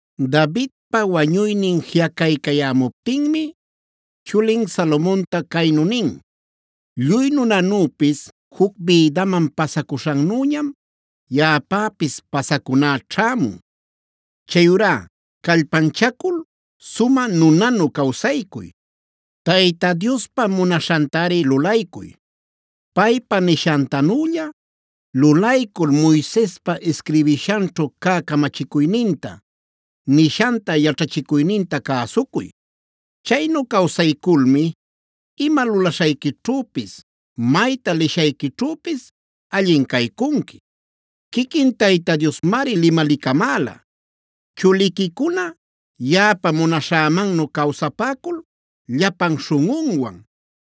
Davidpa wañuynin jiꞌacaycayämuptinmi chulin Salomonta caynu nin: “Lluy nunanüpis juc bïdaman pasacuśhannüñam yaꞌapäpis pasacuná ćhämun. Chayurá callpanchacul sumä nunanu cawsaycuy. Tayta Diospa munaśhantari lulaycuy. Paypa nishantanülla lulaycul Moisespa isquirbishanćhu cä camachicuyninta, nishanta, yaćhachicuyninta cäsucuy. Chaynu cawsayculmi ima lulaśhayquićhüpis, mayta lishayquićhüpis allin caycunqui. Quiquin Tayta Diosmari limalicamäla: ‘Chuliquicuna yaꞌapa munaśhämannu cawsapäcul llapan śhunꞌunwan,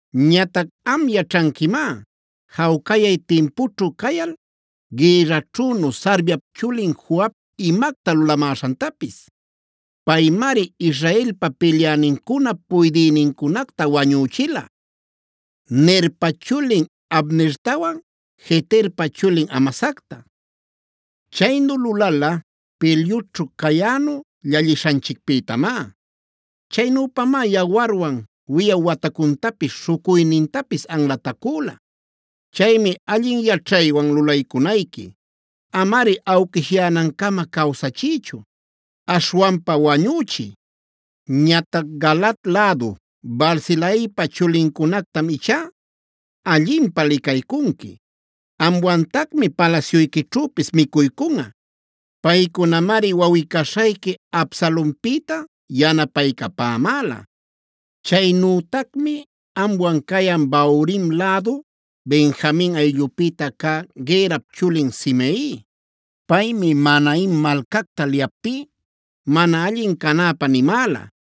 “Ñatac am yaćhanquimá jawcayay timpućhu cayal gïrraćhünu Sarviap chulin Joab imacta lulamäśhantapis. Paymari Israelpa pilyänincunap puydïnincunacta wañüchila: Nerpa chulin Abnertawan,b Jeterpa chulin Amasacta.c Chaynu lulala pilyućhu cayänu llallishanchicpïtamá. Chaynüpamá yawarwan wiꞌaw watacuntapis, śhucuynintapis anlatacüla. Chaymi allin yaćhaywan lulaycunayqui. Amari awquishyänancama cawsachiychu; aśhwanpa wañüchiy. Ñatac Galaad lädu Barzilaipad chulincunactam ichá allinpä licaycunqui. Amwantacmi palasyuyquićhüpis micuycunꞌa. Paycunamari wawꞌi-caśhayqui Absalonpïta yanapaycapämäla. Chaynütacmi amwan cayan Bahurim lädu Benjamin ayllupïta cä Gerap chulin Simei. Paymi Mahanaime malcacta liyaptí mana allin canäpä nimäla.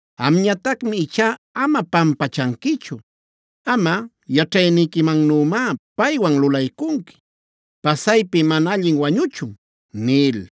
Amñatacmi ichá ama pampachanquichu. Amꞌa yaćhayniquimannümá paywan lulaycunqui. Pasaypi mana allin wañuchun” nil.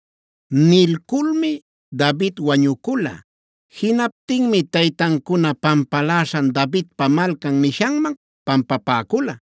Nilculmi David wañucula. Jinaptinmi taytancuna pampaläśhan Davidpa Malcan nishanman pampapäcula.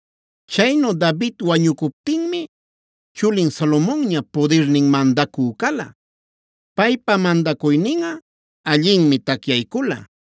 Chaynu David wañucuptinmi chulin Salomonña pudirninh mandacü cala. Paypa mandacuyninꞌa allinmi tacyaycula.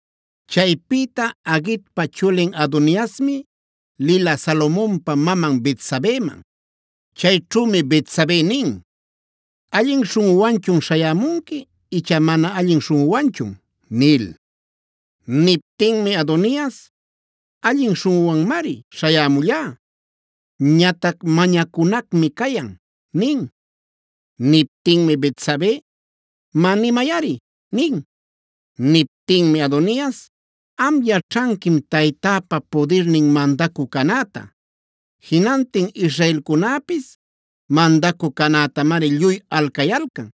Chaypïta Haguitpa chulin Adoniasmi lila Salomonpa maman Betsabeman. Chayćhümi Betsabe nin: “¿Allin śhunꞌuwanchun śhayämunqui icha mana allin śhunꞌuwanchun?” nil. Niptinmi Adonias: “Allin śhunꞌuwanmari śhayämullá. Ñatac mañacunacmi cayan” nin. Niptinmi Betsabe: “Má nimayꞌari” nin. Niptinmi Adonias: “Am yaćhanquim taytäpa pudirnin mandacü canäta. Jinantin Israelcunäpis mandacü canätamari lluy alcayalcan.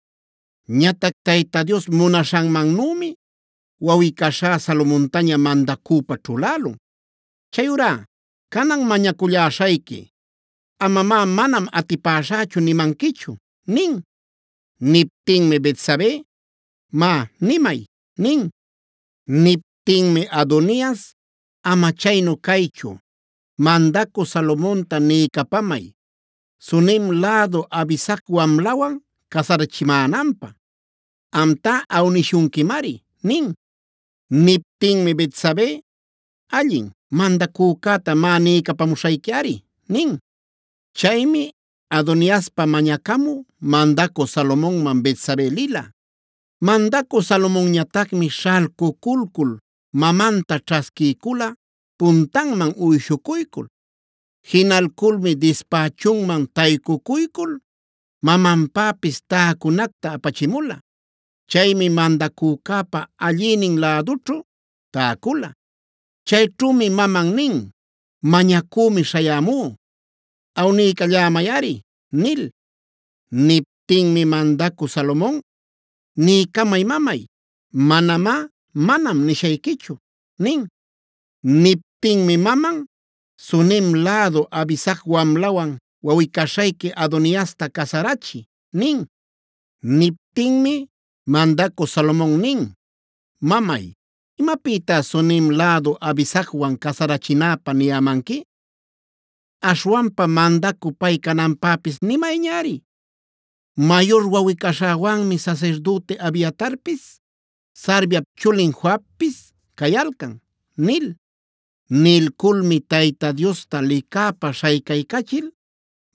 Ñatac Tayta Dios munaśhanmannümi wawꞌi-caśhá Salomontaña mandacüpa ćhulälun. Chayurá canan mañaculläśhayqui. Amamá ‘manam atipaśhächu’ nimanquichu” nin. Niptinmi Betsabe: “Má, nimay” nin. Niptinmi Adonias: “Ama chaynu caychu, mandacü Salomonta niycapamay Sunem lädu Abisag wamlawan casarachimänanpä. Amtá awnishunquimari” nin. Niptinmi Betsabe: “Allin, mandacücäta má niycapamuśhayquiꞌari” nin. Chaymi Adoniaspa mañacamü mandacü Salomonman Betsabe lila. Mandacü Salomonñatacmi śhalcuculcul mamanta ćhasquiycula puntanman uyshucuycul. Jinalculmi dispächunman taycucuycul mamanpäpis täcunacta apachimula. Chaymi mandacücäpa allïnin lädućhu täcula. Chayćhümi maman nin: “Mañacümi śhayämú. Awniycallämayꞌari” nil. Niptinmi mandacü Salomon: “Niycamay mamay. Manamá ‘manam’ nishayquichu” nin. Niptinmi maman: “Sunem lädu Abisag wamlawan wawꞌi-caśhayqui Adoniasta casarachiy” nin. Niptinmi mandacü Salomon nin: “Mamay, ¿imapïtá Sunem lädu Abisagwan casarachinäpä niyämanqui? Aśhwanpa mandacü pay cananpäpis nimayñari. Mayur wawꞌi-caśhäwanmi sasirdüti Abiatarpis, Sarviap chulin Joabpis cayalcan” nil. Nilculmi Tayta Diosta licäpa śhaycaycachil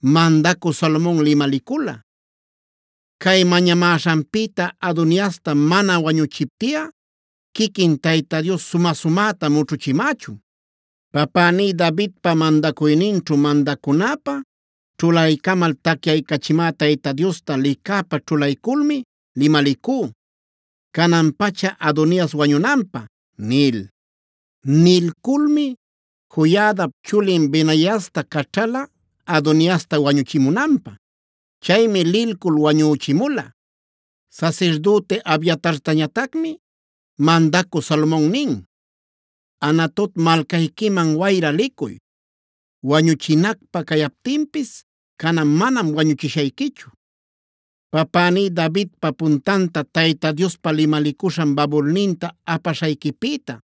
mandacü Salomon limalicula: “Cay mañamäśhanpïta Adoniasta mana wañuchiptiꞌa quiquin Tayta Dios sumä-sumäta mućhuchimächun. Papäní Davidpa mandacuyninćhu mandacunäpä ćhulaycamal tacyaycachimä Tayta Diosta licäpa ćhulayculmi limalicú canan-pacha Adonias wañunanpä” nil. Nilculmi Joiadap chulin Benaiasta caćhala Adoniasta wañuchimunanpä. Chaymi lilcul wañüchimula. Sasirdüti Abiatartañatacmi mandacü Salomon nin: “Anatot malcayquiman wayra licuy. Wañuchinacpä cayaptinpis canan manam wañuchishayquichu, papäní Davidpai puntanta Tayta Diospa limalicuśhan babulninta apaśhayquipïta.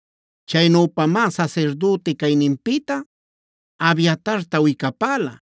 Chaynüpamá sasirdüti cayninpïta Abiatarta wicapäla.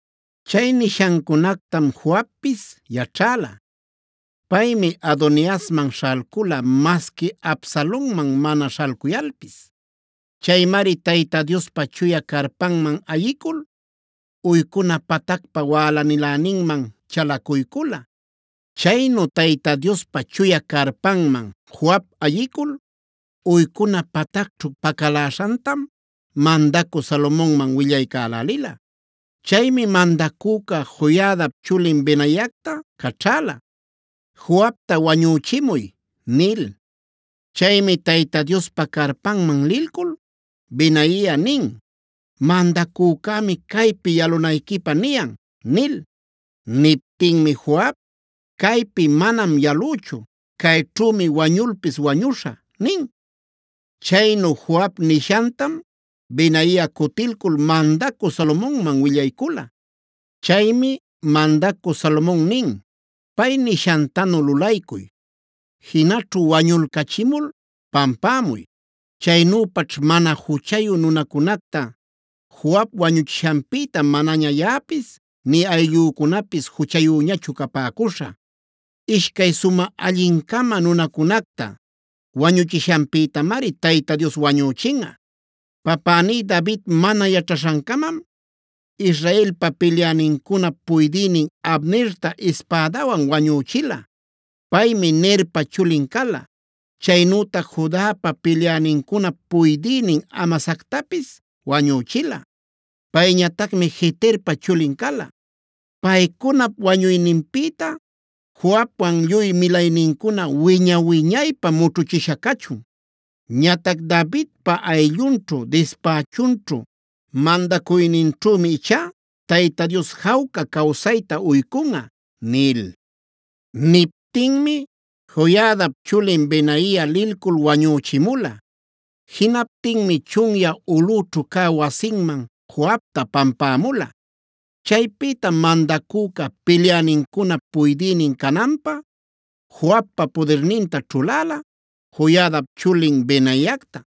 Chay nishancunactam Joabpis yaćhäla. Paymi Adoniasman śhalcula masqui Absalonman mana śhalcuyalpis. Chaymari Tayta Diospa chuya carpanman ayicul uycuna patacpa wälaniläninman chalacuycula. Chaynu Tayta Diospa chuya carpanman Joab ayicul, uycuna patacćhu pacaläśhantam mandacü Salomonman willaycälälila. Chaymi mandacüca Joiadap chulin Benaiacta caćhäla: “Joabta wañüchimuy” nil. Chaymi Tayta Diospa carpanman lilcul Benaia nin: “Mandacücämi caypi yalunayquipä niyan” nil. Niptinmi Joab: “Caypi manam yalüchu. Cayćhümi wañulpis wañuśhä” nin. Chaynu Joab nishantam Benaia cutilcul mandacü Salomonman willaycula. Chaymi mandacü Salomon nin: “Pay nishantanu lulaycuy; jinaćhu wañulcachimul pampämuy. Chaynüpaćh mana juchayu nunacunacta Joab wañuchishanpïta manaña yaꞌapis nï ayllücunapis juchayüñachu capäcuśhä. Ishcay sumä allin-cama nunacunacta wañuchishanpïtamari Tayta Dios wañüchinꞌa. Papäní David mana yaćhaśhancamam Israelpa pilyänincunap puydïnin Abnerta ispädawan wañüchila. Paymi Nerpa chulin cala. Chaynütac Judapa pilyänincunap puydïnin Amasactapis wañüchila. Payñatacmi Jeterpa chulin cala. Paycunap wañuyninpïta Joabwan lluy milaynincuna wiña-wiñaypä mućhuchisha cachun. Ñatac Davidpa ayllunćhu, dispächunćhu, mandacuyninćhümi ichá Tayta Dios jawca cawsayta uycunꞌa” nil. Niptinmi Joiadap chulin Benaia lilcul wañüchimula. Jinaptinmi chunyä ulꞌućhu cä wasinman Joabta pampämula. Chaypïtam mandacüca pilyänincunap puydïnin cananpä Joabpa pudirninta ćhuläla Joiadap chulin Benaiacta.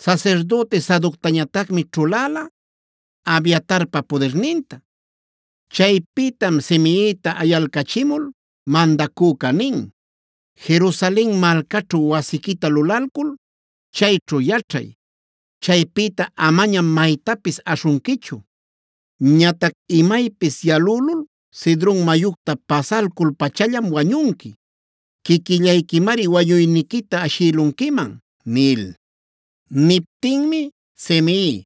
Sasirdüti Sadoctañatacmi ćhulala Abiatarpa pudirninta. Chaypïtam Simeita ayalcachimul mandacüca nin: “Jerusalen malcaćhu wasiquita lulalcul chayćhu yaćhay. Chaypïta amañam maytapis aśhunquichu. Ñatac imaypis yalülul Cedron mayucta pasalcul-pachallam wañunqui. Quiquillayquimari wañuyniquita ashïlunquiman” nil. Niptinmi Simei: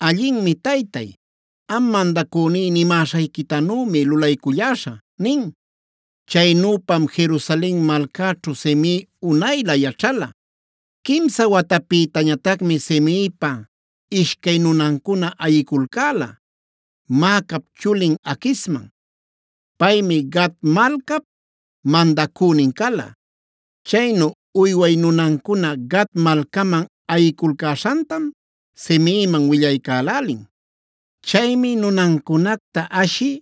“Allinmi taytay. Am mandacüní nimäshayquitanümi lulayculläśhä” nin. Chaynüpam Jerusalen malcäćhu Simei unaylä yaćhala. Quimsa watapïtañatacmi Simeipa ishcay nunancuna ayiculcäla Maacap chulin Aquisman. Paymi Gat malcap mandacünin cala. Chaynu uyway nunancuna Gat malcaman ayiculcäśhantam Simeiman willaycälälin. Chaymi nunancunacta ashï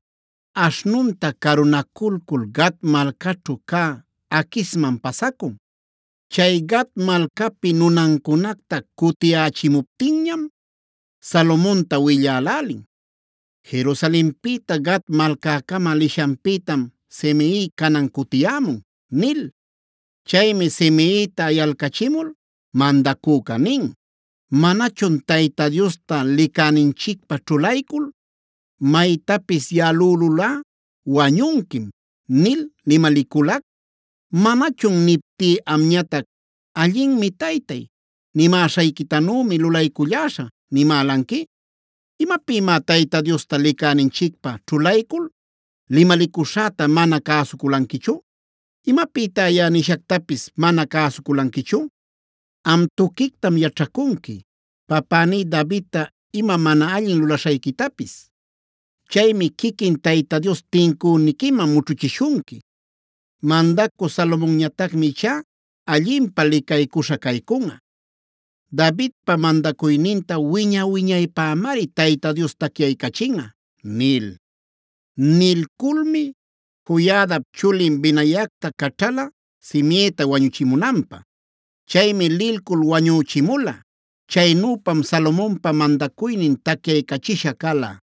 aśhnunta carunaculcul Gat malcaćhu cä Aquisman pasacun. Chay Gat malcapi nunancunacta cutiyächimuptinñam, Salomonta willälälin: “Jerusalenpïta Gat malcäcama lishanpïtam Simei canan cutiyämun” nil. Chaymi Simeita ayalcachimul mandacüca nin: “¿Manachun Tayta Diosta licäninchicpä ćhulaycul: ‘Maytapis yalülulꞌa wañunquim’ nil limaliculac? ¿Manachun niptí amñatac: ‘Allinmi taytay. Nimäśhayquitanümi lulayculläśhä’ nimälanqui? ¿Imapïmá Tayta Diosta licäninchicpä ćhulaycul limalicuśhäta mana cäsuculanquichu? ¿Imapïtá yaꞌa nishactapis mana cäsuculanquichu? “Am tuquictam yaćhacunqui papäní Davidta ima mana allin lulaśhayquitapis. Chaymi quiquin Tayta Dios tincüniquiman mućhuchishunqui. Mandacü Salomonñatacmi ichá allinpä licaycuśha caycunꞌa. Davidpa mandacuyninta wiña-wiñaypämari Tayta Dios tacyaycachinꞌa” nil. Nilculmi Joiadap chulin Benaiacta caćhala Simieta wañuchimunanpä. Chaymi lilcul wañüchimula. Chaynüpam Salomonpa mandacuynin tacyaycachisha cala.